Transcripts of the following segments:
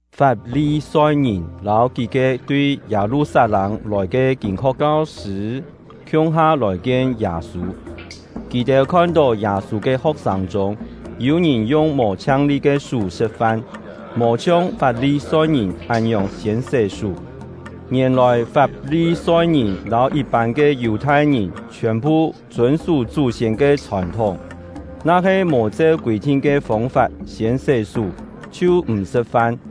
Fap-li-soi-ngìn lâu kí-ke tui Yâ-lu-sat-lâng lòi ke kîn-ho̍k kau-sṳ̂ khiung-ha lòi kien Yâ-sû. Kì-têu khon-tó Yâ-sû ke ho̍k-sâng chûng yû-ngìn yung mò chhiang-li ke sú sṳ̍t-fan, mò chhiong Fap-li-soi-ngìn án-ngiòng siên sé-sú. (Ngièn-lòi Fap-li-soi-ngìn lâu yit-pân ke Yù-thai-ngìn chhiòn-phu chûn-sú chú-siên ke chhòn-thúng, na-he mò cheu kûi-thin ke fông-fap siên sé-sú chhiu m̀ sṳ̍t-fan;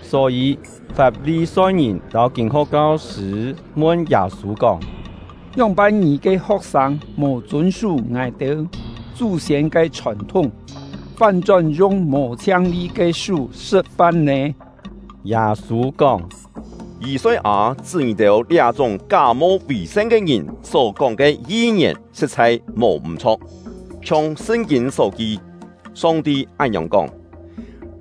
Só-yî Fap-li-soi-ngìn lâu kîn-ho̍k kau-sṳ̂ mun Yâ-sû kóng: “Ngióng-pân ngì ke ho̍k-sâng mò chûn-sú ngài-têu chú-siên ke chhòn-thúng, fán-chón yung mò chhiang-li ke sú sṳ̍t-fan nè?” Yâ-sû kóng: “Yî-soi-â chṳ́ ngì-têu liá-chúng ká-mo vì-san ke ngìn só-kóng ke yi-ngièn sṳ̍t-chhai mò m̀-chho̍k! Chhiong Sṳn-kîn só ki: Song-ti án-ngiòng kóng: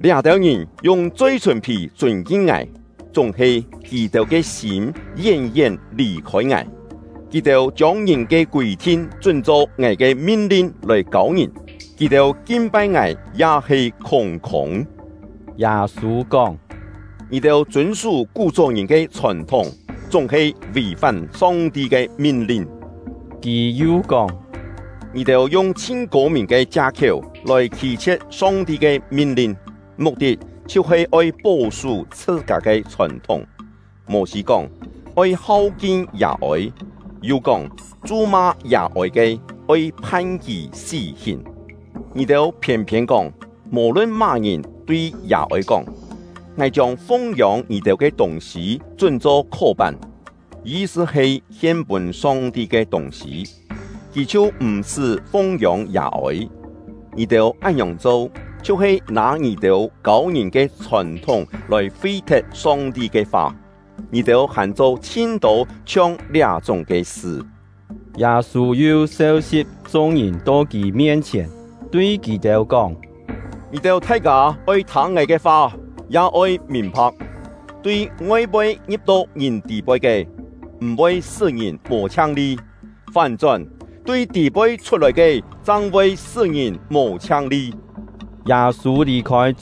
‘Liá-têu ngìn yung choi-sùn-phì chûn-kin Ngài, chúng-he kì-têu ke sîm yén-yén lì-khôi Ngài. Kì-têu chiông ngìn ke kûi-thin chún-cho Ngài ke min-lin lòi kâu ngìn; kì-têu kin-pai Ngài ya he khûng-khûng.’” Yâ-sû kóng: “Ngì-têu chûn-sú kú-chó ngìn ke chhòn-thúng, chúng-he vì-fán Song-ti ke min-lin.” Kì yu kóng: “Ngì-têu yung chhin kô-mìn ke chia-khiéu lòi khî-chhie̍t Song-ti ke min-lin, muk-tit chhiu-he oi pó-sú chhṳ-kâ ke chhòn-thúng. Mô-sî kóng: ‘Oi hau-kin yà-ôi’; yu kóng: ‘Chu-ma yà-ôi ke, oi phan kì sí-hìn.’ Ngì-têu phiên-phiên kóng, mò-lun má-ngìn tui yà-ôi kóng: ‘Ngài chiông fung-yông ngì-têu ke tûng-sî chún-cho Khó-pán’ (yi-sṳ he hien-pûn Song-ti ke tûng-sî), kì chhiu m̀-sṳ́ fung-yông yà-ôi. Ngì-têu án-ngiòng cho, chhiu-he nâ ngì-têu kâu ngìn ke chhòn-thúng lòi fi-thet Song-ti ke fa. Ngì-têu hàn cho chhin-tô chhiong liá-chúng ke sṳ.” Yâ-sû yu seu-si̍p chung-ngìn to kì mien-chhièn, tui kì-têu kóng: “Ngì-têu thai-kâ oi thâng ngài ke fa, ya oi mìn-pha̍k. Tui ngoi-poi ngi̍p-to ngìn tî-poi ke, m̀-voi sṳ́ ngìn mò chhiang-li; fán-chón, tui tî-poi chhut-lòi ke chang voi sṳ́ ngìn mò chhiang-li. Yû-têu kú-kién kâ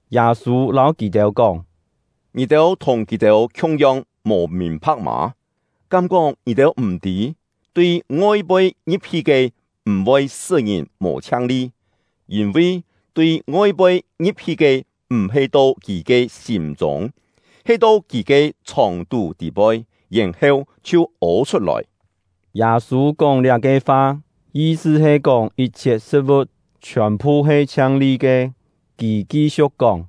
Yâ-sû lâu kì-têu kóng: “Ngì-têu thùng kì-têu khiung-yong mò mìn-pha̍k mâ? Kám-kóng ngì-têu m̀ tî? Tui ngoi-poi ngi̍p-hi ke m̀-voi sṳ́ ngìn mò chhiang-li; yîn-vi tui ngoi-poi ngi̍p-hi ke m̀-he to kì ke sîm-chûng, he to kì ke chhòng-tú tî-poi, yèn-heu chhiu ô chhut-lòi.” (Yâ-sû kóng liá-ke fa, yi-sṳ he kóng yit-chhiet sṳ̍t-vu̍t chhiòn-phu he chhiang-li ke.) Kì ki-siu̍k kóng: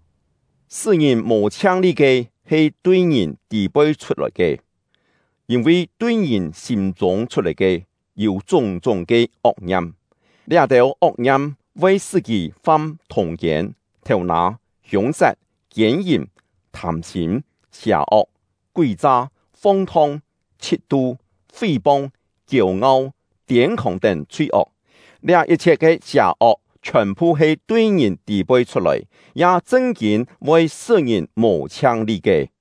“Sṳ́ ngìn mò chhiang-li ke he tui ngìn tî-poi chhut-lòi ke. Yîn-vi tui ngìn sîm-chûng chhut-lòi ke, yû chúng-chúng ke ok-ngiam; liá-têu ok-ngiam voi sṳ́ kì fam thûng-kiên, thêu-nâ, hiûng-sat, kiên-yìm, thâm-sîm, sià-ok, kúi-cha, fong-thong, chhit-tu, fí-pong, kiêu-ngau, tiên-khòng tén chhui-ok. Liá yit-chhiet ke sià-ok chhiòn-phu he tui ngìn tî-poi chhut-lòi, ya chṳn-kîn voi sṳ́ ngìn mò chhiang-li ke.”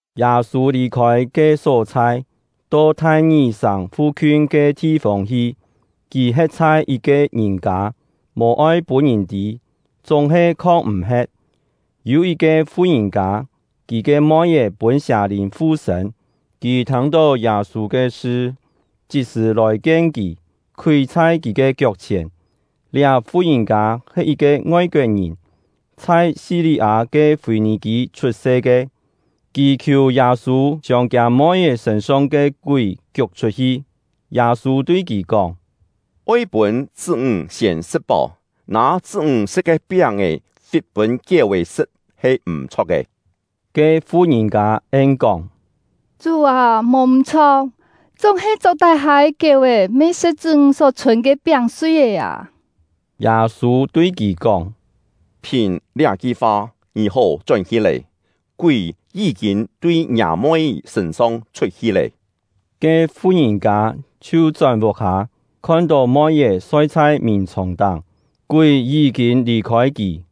Yâ-sû lì-khôi ke só-chhai, to Thai-ngì-sàng fu-khiun ke thi-fông hi. Kì he̍t chhai yit-ke ngìn-kâ, mò-oi pûn ngìn tî, chúng-he khong m̀-he̍t. Yû yit-ke fu-ngìn-kâ, kì ke moi-é pûn sià-lìn fu-sṳ̂n. Kì thâng-tó Yâ-sû ke sṳ, chit-sṳ̀ lòi-kien kì, khúi chhai kì ke kiok-chhièn. Liá fu-ngìn-kâ he yit-ke ngoi-koet-ngìn, chhai Si-li-â ke Fî-nì-kî chhut-se ke. Kì khiù Yâ-sû chiông kiâ moi-é sṳ̂n-song ke kúi kiuk chhut-hi. Yâ-sû tui kì kóng: “Oi pûn chṳ́-ńg siên sṳ̍t-páu; nâ chṳ́-ńg sṳ̍t ke piáng-è fit pûn kiéu-è sṳ̍t he m̀-chho̍k ke.” Ke fu-ngìn-kâ en-kóng: “Chú â, mò m̀-chho̍k, chúng-he chok-tái-hâ ke kiéu-è me sṳ̍t chṳ́-ńg só chhûn ke piáng-sui-é â!” Yâ-sû tui kì kóng: “Phìn liá-ki fa, ngì hó chón-hi lé; kúi yí-kîn tui ngiâ moi-é sṳ̂n-song chhut-hi lé!” Ke fu-ngìn-kâ chhiu chón vuk-hâ, khon-tó moi-é soi chhai mìn-chhòng-táng; kúi yí-kîn lì-khôi kì.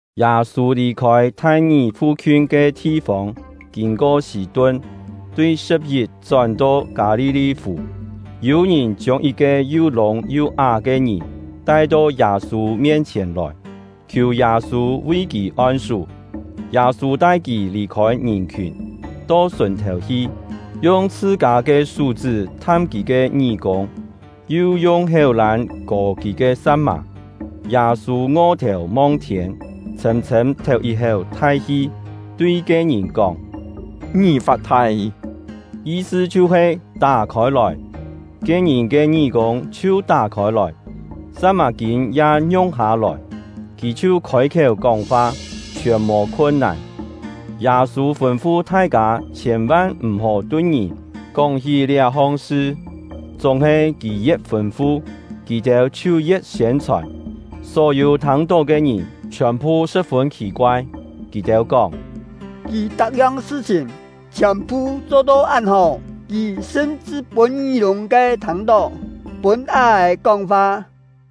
Yâ-sû lì-khôi Thai-ngì fu-khiun ke thi-fông, kîn-ko Sî-tun, tui Sṳ̍p-yip chón-to Kâ-li-li-fù. Yû ngìn chiông yit-ke yu lûng yu á ke ngìn tai-to Yâ-sû mien-chhièn lòi, khiù Yâ-sû vi kì on-sú. Yâ-sû tai kì lì-khôi ngìn-khiùn, to sùn-thèu hi, yung chhṳ-kâ ke sú-chṳ́ tham kì ke ngí-kûng, yu yung héu-lân kò kì ke sa̍t-mà. Yâ-sû ngo-thèu mong-thiên, chhṳ̂m-chhṳ̂m théu yit-héu thai-hi, tui ke-ngìn kóng: “Ngì-fat-thai!” yi-sṳ chhiu-he “Tá khôi-lòi!” Ke-ngìn ke ngí-kûng chhiu tá khôi-lòi, sa̍t-mà-kîn ya ngiung-hâ-lòi, kì chhiu khôi-khiéu kóng-fa, chhiòn mò khun-nàn. Yâ-sû fûn-fu thai-kâ chhiên-van m̀-hó tui ngìn kóng-hí liá-hong sṳ; chúng-he kì ye̍t fûn-fu, kì-têu chhiu ye̍t siên-chhòn. Só-yû thâng-tó ke ngìn chhiòn-phu sṳ̍p-fûn khì-koai; kì-têu kóng: “Kì tak-yong sṳ-chhìn chhiòn-phu cho-to án hó! Kì sṳm-chṳ pûn ngí-lûng ke thâng-tó, pûn á-è kóng-fa!”